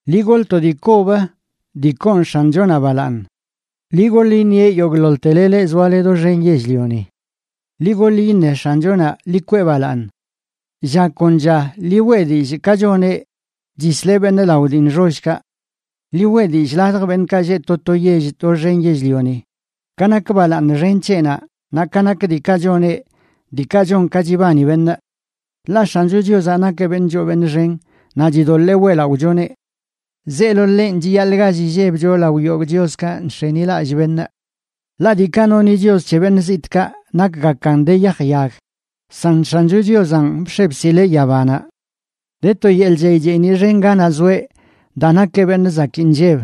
Ḻi goḻ to dii kob dii koon X̱anchonaꞌ balaaṉ; ḻi goḻ iṉieꞌ yogꞌḻoḻtele leꞌ zoale doxen yell-lioni. Ḻi gol iṉe X̱anchonaꞌ, ḻi kwee balaaṉ. Lla kon lla liꞌ weꞌ dillꞌ ka choneꞌ chisleꞌ beṉꞌ lao dii nxollkaꞌ. Ḻi weꞌ dillꞌ ladj beṉꞌkaꞌ lleꞌ to to yell doxen yell-lioni, ka nak balaaṉ xen c̱heꞌnaꞌ naꞌ ka nak diikaꞌ choneꞌ diikaꞌ chon ka chibani beṉꞌ. Ḻaꞌ X̱ancho Chiozaꞌ nakeꞌ beṉꞌ choo beṉꞌ xen naꞌ chidoḻee weꞌlaꞌochoneꞌ; zeelo ḻenꞌ chiyaḻꞌ gall illebcho lao yogꞌ chioskaꞌ nx̱enilallꞌ beṉꞌ. Ḻaꞌ diikaꞌ noni chios c̱he beṉꞌ zitꞌkaꞌ nakgakan de yaj yag, san X̱ancho Chiozanꞌ bx̱e bsileꞌ yabanaꞌ. De to yeḻꞌ chey cheeniꞌ xen ganaꞌ zoeꞌ daa nakeꞌ beṉꞌ zakii nlleb.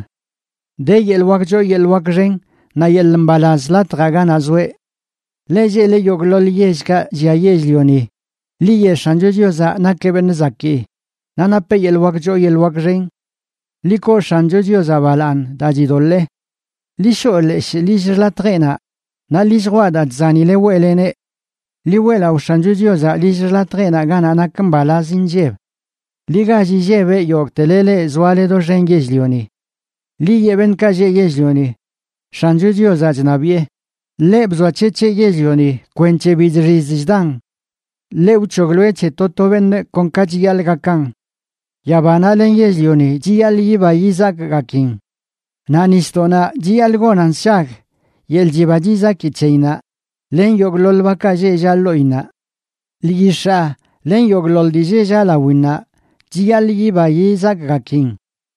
De yeḻꞌ wak choo yeḻꞌ wak xen naꞌ yeḻꞌ mbalaz latjaꞌ ganaꞌ zoeꞌ. Leꞌ lleꞌle yogꞌḻoḻ yellkaꞌ llia yell-lioni, ḻi yeꞌ X̱ancho Chiozaꞌ nakeꞌ beṉꞌ zakii, naꞌ napeꞌ yeḻꞌ wak choo yeḻꞌ wak xen. Ḻi koo X̱ancho Chiozaꞌ balaaṉ daa chidoḻee. Ḻi shoꞌ leshꞌ lill xḻatjeꞌnaꞌ naꞌ ḻi lljwaꞌ daa chzanile weꞌleneꞌ. Ḻi weꞌlaꞌo X̱ancho Chiozaꞌ lill xḻatjeꞌnaꞌ ganaꞌ nak mbalaz inlleb. ¡Ḻi gall illebeꞌ, yogꞌtele leꞌ zoale doxen yell-lioni! Ḻi yeꞌ beṉꞌkaꞌ lleꞌ yell-lioni: “¡X̱ancho Chiozaꞌ chṉabiꞌe!” Ḻeꞌ bzoac̱hec̱heꞌ yell-lioni kwenc̱he bi chxiz chdan; ḻeꞌ wc̱hogloeꞌ c̱he to to beṉꞌ kon ka chiyaḻꞌ gakan. Yabanaꞌ len yell-lioni, chiyaḻꞌ yiba yizakgakin; naꞌ nisdoꞌnaꞌ chiyaḻꞌ gonan sshag yeḻꞌ chiba chizaki c̱heyinnaꞌ len yogꞌḻoḻ bakaꞌ lleꞌ llaꞌ ḻoꞌinnaꞌ. Lyix̱aa len yogꞌḻoḻ dii lleꞌ llaꞌ lawinnaꞌ chiyaḻꞌ yiba yizakgakin.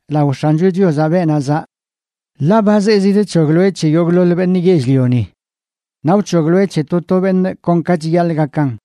lao X̱ancho Chiozaꞌ, beenaꞌ zaꞌ. Ḻaꞌ ba zee zidc̱hogloeꞌ c̱he yogꞌḻoḻ beṉꞌ yell-lioni; naꞌ wc̱hogloeꞌ c̱he to to beṉꞌ kon ka chiyaḻꞌ gakan.